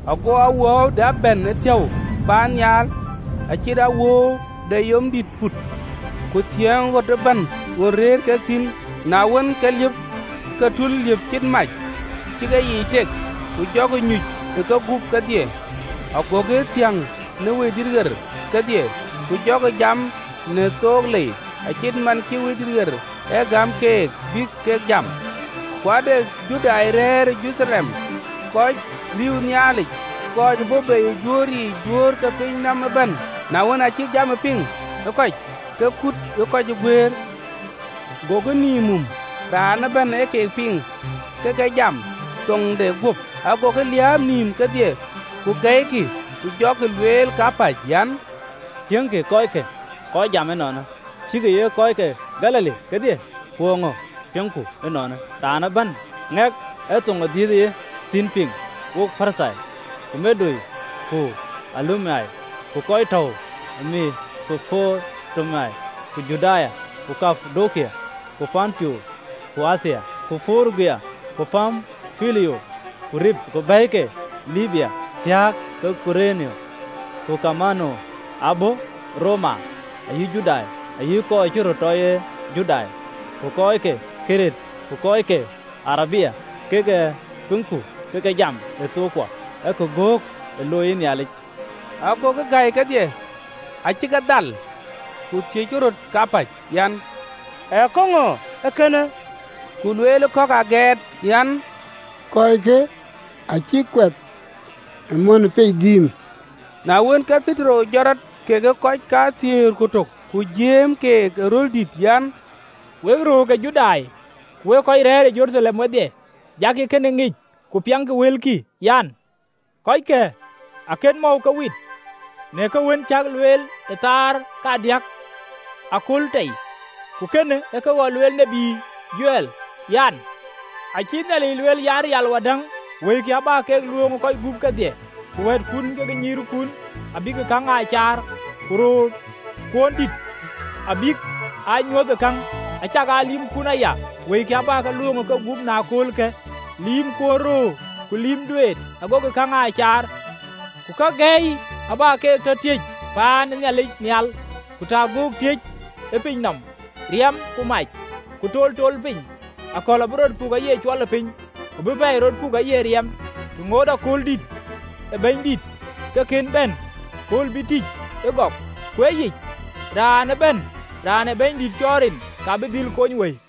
Ago awuööu dap bɛ̈n ëthiäu paannhial, acït awuööu de yom dïït put, ku thiëëŋ ɣöt ëbɛ̈n ɣön rëër kek thïn. Na wën, ke liëp ë ke tul, liëp cït mac, cï keyiic tek: ku jɔkï nyuc ë kegup kedhie. Agokï thiäŋ në Wëidït ɣer kedhie, ku jɔkï jam në thok lei, acït man cï Wëidït ɣer e gäm keek bï kek jam. Ku ade Judai rɛ̈ɛ̈r ë Jeruthalem, kɔc riëëu Nhialic, kɔc ë bɔ̈ bei ë juöör yiic juöör ke pinynɔm ëbɛ̈n. Na wën, aacï jamë piŋ ë kɔc, ke kut ë kɔc ë guëër, gokï nïïm mum, raan ëbɛ̈n ë keek piŋ ke ke jam ë thoŋde guöp. Ago ke liääp nïïm kedhie ku gɛ̈ikï, ku jɔkï lueel kapäc an, “Tiëŋkï kɔckë, kɔc jam ënɔɔnë, cïkï ye kɔc ke Galili kedhie? Ku eeŋö piŋku ënɔɔnë, raan ëbɛ̈n, ŋɛk ë thoŋ ë dhiëëth ë ye thïn piŋ? Wo Parthoi, ku Medo, ku Eelam, ku kɔc tɔ̈u ë Methopotamia, ku Juda, ku Kapadokia, ku Ponto, ku Athia, ku Purugia, ku Pampulia, ku Rip, ku bɛ̈i ke Libya thiɔ̈k ke Kurene, ku kamaan ë bɔ̈ Roma, ayï Judai ayï kɔc ë cï röt tɔ ye Judai, ku kɔc ke Keret, ku kɔc ke Arabia, kek a piŋku ke ke jam në thookkuɔ ë kagöök ë looi Nhialic!” Agokï gäi kedhie, acï ke dhal, ku thiëckï röt kapäc an, “Ee käŋö ee kënë?” Ku lueel kɔ̈k agɛɛt an, “Kɔckë acïk kuɛth ë mɔ̈n ë piac dhiim!” Na wën, ke Petero jɔt rɔt kekë kɔc kathiëër ku tök, ku jiëëm keek ë röl dït, an, “Wek juöör ke Judai, ku wek kɔc rɛ̈ɛ̈r ë Jeruthalem wedhie, jakï kënë ŋic, ku piɛŋkï wëlkï. Kɔckë akën mɔ̈u ke wit, në ke wën cäk lueel, ee thaar kadiäk aköl tei, ku kënë ee kë ɣɔn lueel ë tiët Jowɛl, (LXX). An, ‘Acï Nhialic lueel an, Miäk wadäŋ, Wëikï abä ke luööŋ ë kɔc gup kedhie. Ku wɛ̈ɛ̈tkun ku nyïïrkun abïk käŋ aa caar, ku röörkuöndït abïk aa nyuöth ë käŋ. Acakaa lïïmkun aya, Wëikï abä ke luööŋ ë kegup në aköölkë, Lïïmkuön röör ku lïïm duet, agokï käŋ aa caar. Ku kake gäi abä ke tɔ tiëc tënhial, Ku ta göök tiëc ë piny nɔm, Riɛm, ku mac, ku toltool ë piny: Akɔ̈l abï rɔt puk aye cuɔlëpiny, ku bï pɛɛi rɔt puk aye riɛm, Të ŋoot ëkööldïït ë Bɛ̈nydït ke kën bɛ̈n, kööl bï tïc ëgɔk: Ku ë yic, raan ëbɛ̈n raan ë Bɛ̈nydït cɔɔl rin, ka bï dhil kony wëi.’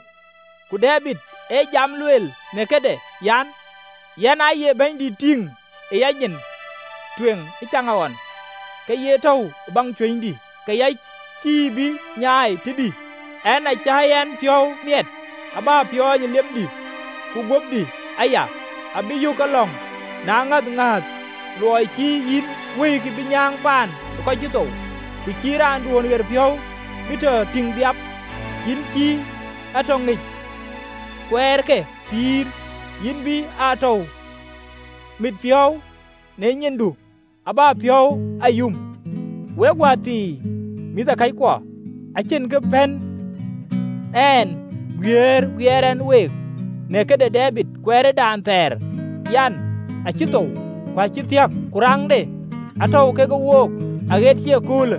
(LXX). Ku Debid ë jam luel në këde an, ‘Yɛn aaye Bɛ̈nydït tïŋ ë a nyin tueŋ ëcaŋɣɔn, ke ye tɔ̈u ë baŋ cuënydï, ke ya cïï bï nyaai tëdï. En acä yɛn piɔ̈u miɛt, abä piɔɔny ë liemdï, ku guöpdï aya abï yök ke lɔ̈ŋ në aŋäth ŋääth: Luɔi cïï yïn wëikï bï nyääŋ paan ë thuɔɔu, ku cïï raanduön ɣeric bï tɔ tïŋ dhiap. Yïn cï a tɔ ŋic kuɛɛr ke pïïr, Yïn bï a tɔ mit piɔ̈u në nyindu abä piɔ̈u a yum.’ “Wek wäthii mïthëkɔckuɔ, acïn kë pën ɛn guiëër guiëër ɛn week në këde Debid kuɛɛrdan thɛɛr an, abï thou, ku acï thiɔ̈k, ku raŋde atɔ̈u kekë wook aɣet cï ëköölë.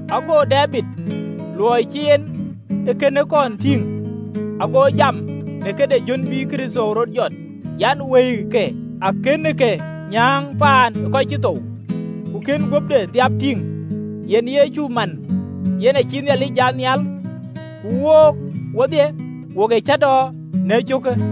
Ago Debid, luɔi cï en kënë kɔn tïŋ, ago jam në këde jön bï Kërtho rɔt jɔt, an, ‘Wëike akënë ke nyääŋ paan ë thuɔɔu, ku kën guöpde dhiap tïŋ.’ Yen Yecu manë, yen acïï Nhialic jat nhial, ku wook wodhie wok ee cäätɔɔ në ee cöökë.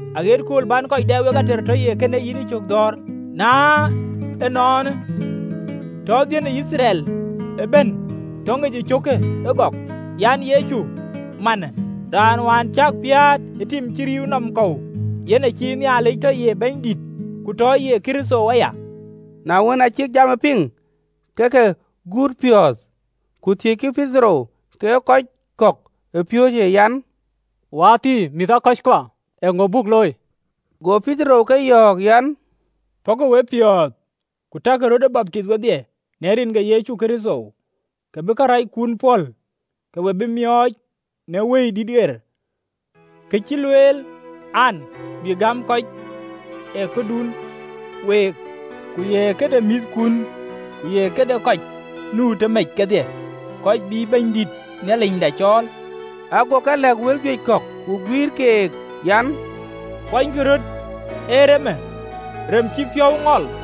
Aɣet kööl bän kɔc dɛ wek ater tɔ ye kën ee yïn yïcök dhɔ̈ɔ̈r.’ “Na ënɔɔnë, tɔ baai de Yithriɛl ëbɛ̈n tɔ ŋic cöökë ëgɔk an, Yecu manë, raan wään cäk piäät ë tim cï rïïu nɔm kɔ̈u, yen acïï Nhialic tɔ ye Bɛ̈nydït ku tɔ ye Kërtho aya!” Na wën, aa cïk jamë piŋ, ke ke guutë piɔ̈ɔ̈th, ku thiëckï Petero kekë kɔc kɔ̈k ë piööcë an, “Wäthii mïthëkɔckuɔ, eeŋö buk looi?” Go Petero ke yɔ̈ɔ̈k an, “Pɔ̈kkï wepiɔ̈ɔ̈th, ku takï röt baptith wedhie në rin ke Yecu Kërtho, ke bï karɛckun pɔ̈l, ke we bï miɔɔc në Wëidït ɣer. Kë cï lueel an, bï gäm kɔc, ee këdun week, ku ye këde mïthkun, ku ye këde kɔc nu tëmec kedhie, kɔc bïï Bɛ̈nydït Nhialicda cɔɔl.” Ago ke lɛ̈k wël juëc kɔ̈k ku guïïr kek an, “Kuɔnykï röt ee remë rem cï piɔ̈u ŋɔl.”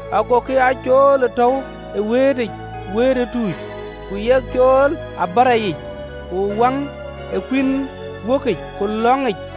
Agokï aa cool ë tɔ̈u ë wëëtic wëët ë tuuc, ku yek cool ë abärɔ yic, ku wäŋ ee kuïn wökic, ku lɔ̈ŋic.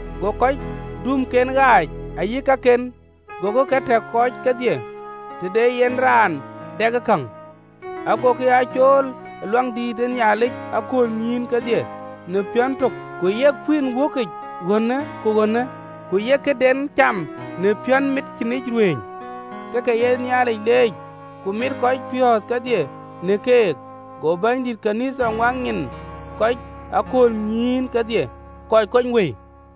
Go kɔc duumken ɣaac ayï kaken, gokï ke tɛ̈k kɔc kedhie, të de yen raan dɛkë käŋ. Agokï aa cool ë Luaŋdïtic aköölnyïïn kedhie në piɔ̈n tök, ku yek kuïn wääkic ɣönë ku ɣönë, ku yek këden cam në piɔ̈nmit cïnic ruëëny, ke ke ye Nhialic leec, ku mit kɔc piɔ̈ɔ̈th kedhie në keek. Go Bɛ̈nydït ɣön ë Nhialic ŋuak nyin ë kɔc ë aköölnyïïn kedhie kɔc kony wëi.